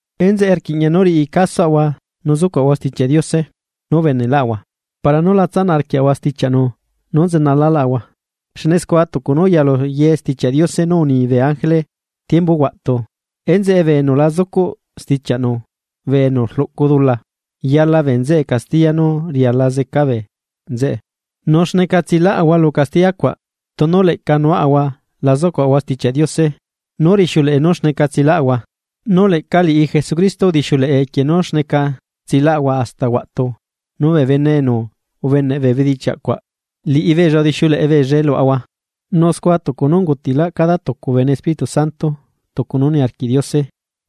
Enzeꞌe, rquiꞌña nú riꞌi casoꞌahua nu zucuaꞌahua Stichiaꞌ Diose nú ubeneꞌlaꞌahua para nú la tsanaꞌ arquiaꞌahua stichiaꞌnu nú nzenalaꞌlaꞌahua. Xne scua tucu nú uyalu ye Stichiaꞌ Diose nú uni bee ángele tiembu huaꞌtu enzeꞌe bee bene enu la zucuꞌ stichiaꞌnu bee enu rluꞌcu dula, yala bee nzeꞌe castiya nú riala zeca bee nzeꞌe. Nu, ¿xneca tsilaꞌahua lu castiya cuaꞌ, tunu leꞌca nuaꞌahua la zucuꞌahua Stichiaꞌ Diose, nú rixiuleꞌe nú xneca tsilaꞌahua? Nu leꞌca liꞌi Jesucristo udixiuleꞌe equie nú xneca tsilaꞌahua hasta huaꞌtu nu bee bene enu ubeneꞌ bee bedichiaꞌ cuaꞌ, liꞌibeella udixiuleꞌe beellae luaꞌahua. Nu scua tucu nú ungutiꞌlaꞌ cada tucu bene Espíritu Santo tucu nú niarquiꞌ Diose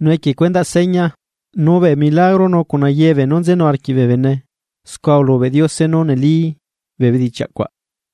nu equie cuendaꞌ seña, nu bee milagro nu cuna ye beenú nzenu arquiꞌ bee bene scua ulubeꞌ Diose nú neli bee bedichiaꞌ cuaꞌ.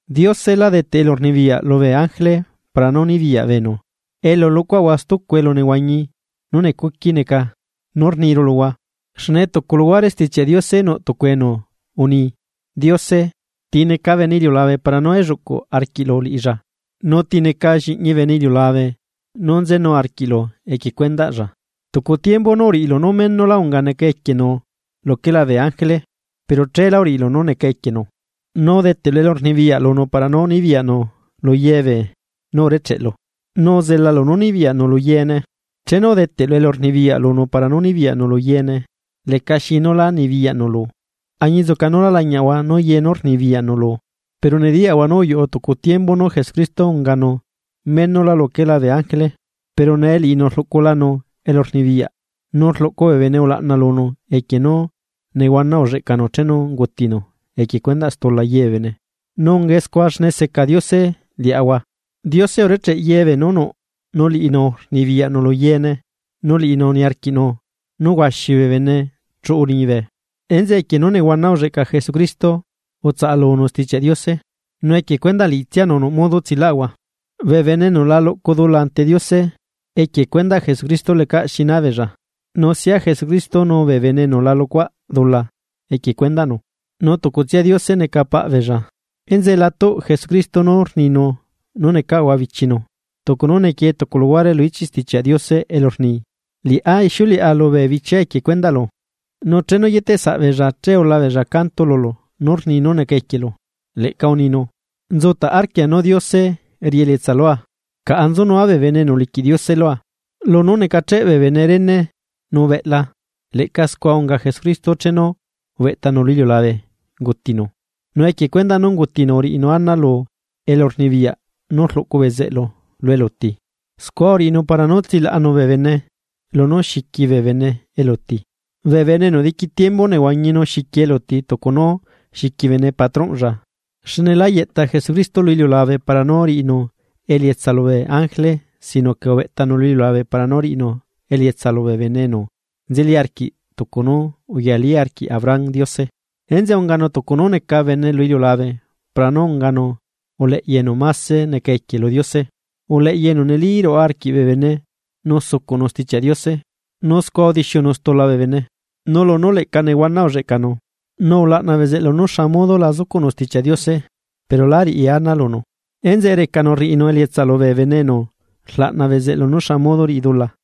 Diose la deteꞌ elurnibiyaꞌ lubee ángele para nú nibiyaꞌ beenu elu luꞌcuaꞌahua stucu elu nehuañi nú necuqui neca nú rniru luhua. Xne tucu luhuare Stichiaꞌ Diose nuꞌ tucu enu uni: Diose, ¿ti neca bene iliulabe para nú elluꞌcuꞌ arquiꞌlu liꞌilla? ¿Nu ti neca lliꞌñi bene iliulabe nú nzenu arquiꞌlu? ¿equie cuendaꞌlla? Tucu tiembu nú uriꞌilu nú menula unga neca equienu luquela bee ángele, pero cheelá uriꞌilu nú neca equienu, nu udeteꞌlu elurnibiyaꞌ lunu para nú nibiyaꞌnu lu ye beenú urecheꞌlu; nu uzelalu nú nibiyaꞌnu lu yeene. Chenu udeteꞌlu elurnibiyaꞌ lunu para nú nibiyaꞌnu lu yeene, lecaxi nú la nibiyaꞌnu lu, añinzuca nú lá lañiaꞌahua nú ye nú rnibiyaꞌnu lu. Pero nediyaꞌahua nú uyuꞌu tucu tiembu nú Jesucristo unganu menola luquela bee ángele. Pero nee liꞌinu rluꞌculanu elurnibiyaꞌ, nu rluꞌcu bee bene ulaꞌna lunu equie nú nehuana ulleꞌcanu chenu ungutinu equie stula yebee bene, nu ungae scua xne seca Diose liaꞌahua. Diose urecheꞌ ye beenú nuꞌ nu liꞌinu rnibiyaꞌnu lu yeene nu liꞌinu niarquiꞌnu nú huaxi bee bene chuꞌu liñibe. Enzeꞌe equie nú nehuana ulleꞌca Jesucristo utsaꞌalunu Stichiaꞌ Diose, nu equie cuendaꞌ liꞌitsianu nuꞌ modo tsilaꞌahua. Bee bene enu la luꞌcu dula ante Diose, equie cuendaꞌ Jesucristo lecaꞌ xi ná beella. Nu sia Jesucristo nu bee bene enu la luꞌcuaꞌ dula equie cuendaꞌnu, nu tucutsia Diose neca paꞌ beella. Enzeꞌe la tuꞌ Jesucristo nú rninu nú necaꞌahua bichinu. Tucu nú nequie tucu luguare lu ichiꞌ Stichiaꞌ Diose elu rni: Liꞌá ixiuleꞌa lubee bichiaa equie cuendaꞌlu, nu chenu yieteꞌsaꞌ beella che ula beella canto lulu nú rni nú neca equielu. Leꞌca uninu: Nzutaꞌ arquia nú Diose riꞌi elietsa lua. Caꞌa nzunua bee bene enu uliquiꞌ Diose lua. Lunú necacheꞌ bee bene rene nu beꞌla, leꞌca scua unga Jesucristo chenu ubeꞌtanu lu iliulabe ungutinu, nu equie cuendaꞌ nú ungutinu uriꞌinu ana lu elurnibiyaꞌ nú rluꞌcu bezeꞌlu lu eluti. Scua uriꞌinu para nú tsilaꞌanu bee bene lunú xiqui bee bene eluti, bee bene enu diqui tiembu nehuañi nu xiqui eluti tucu nú xiqui bene patronꞌlla. Xne lá yeꞌta Jesucristo lu iliulabe para nú riꞌinu elietsa lubee ángele sino que ubeꞌtanu lu iliulabe para nú riꞌinu elietsa lubee bene enu nzeli arquiꞌ tucu nú uyalí arquiꞌ Abraham Diose. Enzeꞌe unganu tucu nú neca bene lu iliulabe para nú unganu uleꞌya enu máse neca equie lu Diose, uleꞌya enu neli ruaꞌa arquiꞌ bee bene nu sucuꞌnu Stichiaꞌ Diose nu scua udixiunu stula bee bene. Nu lunú leꞌca nehuana ulleꞌcanu, nu ulaꞌna bezeꞌlu nú xa modo la zucuꞌnu Stichiaꞌ Diose, pero lá riꞌi ana lunu, enzeꞌe recanu rriꞌinu elietsa lubee bene enu rlaꞌna bezeꞌlu nú xa modo riꞌi dula.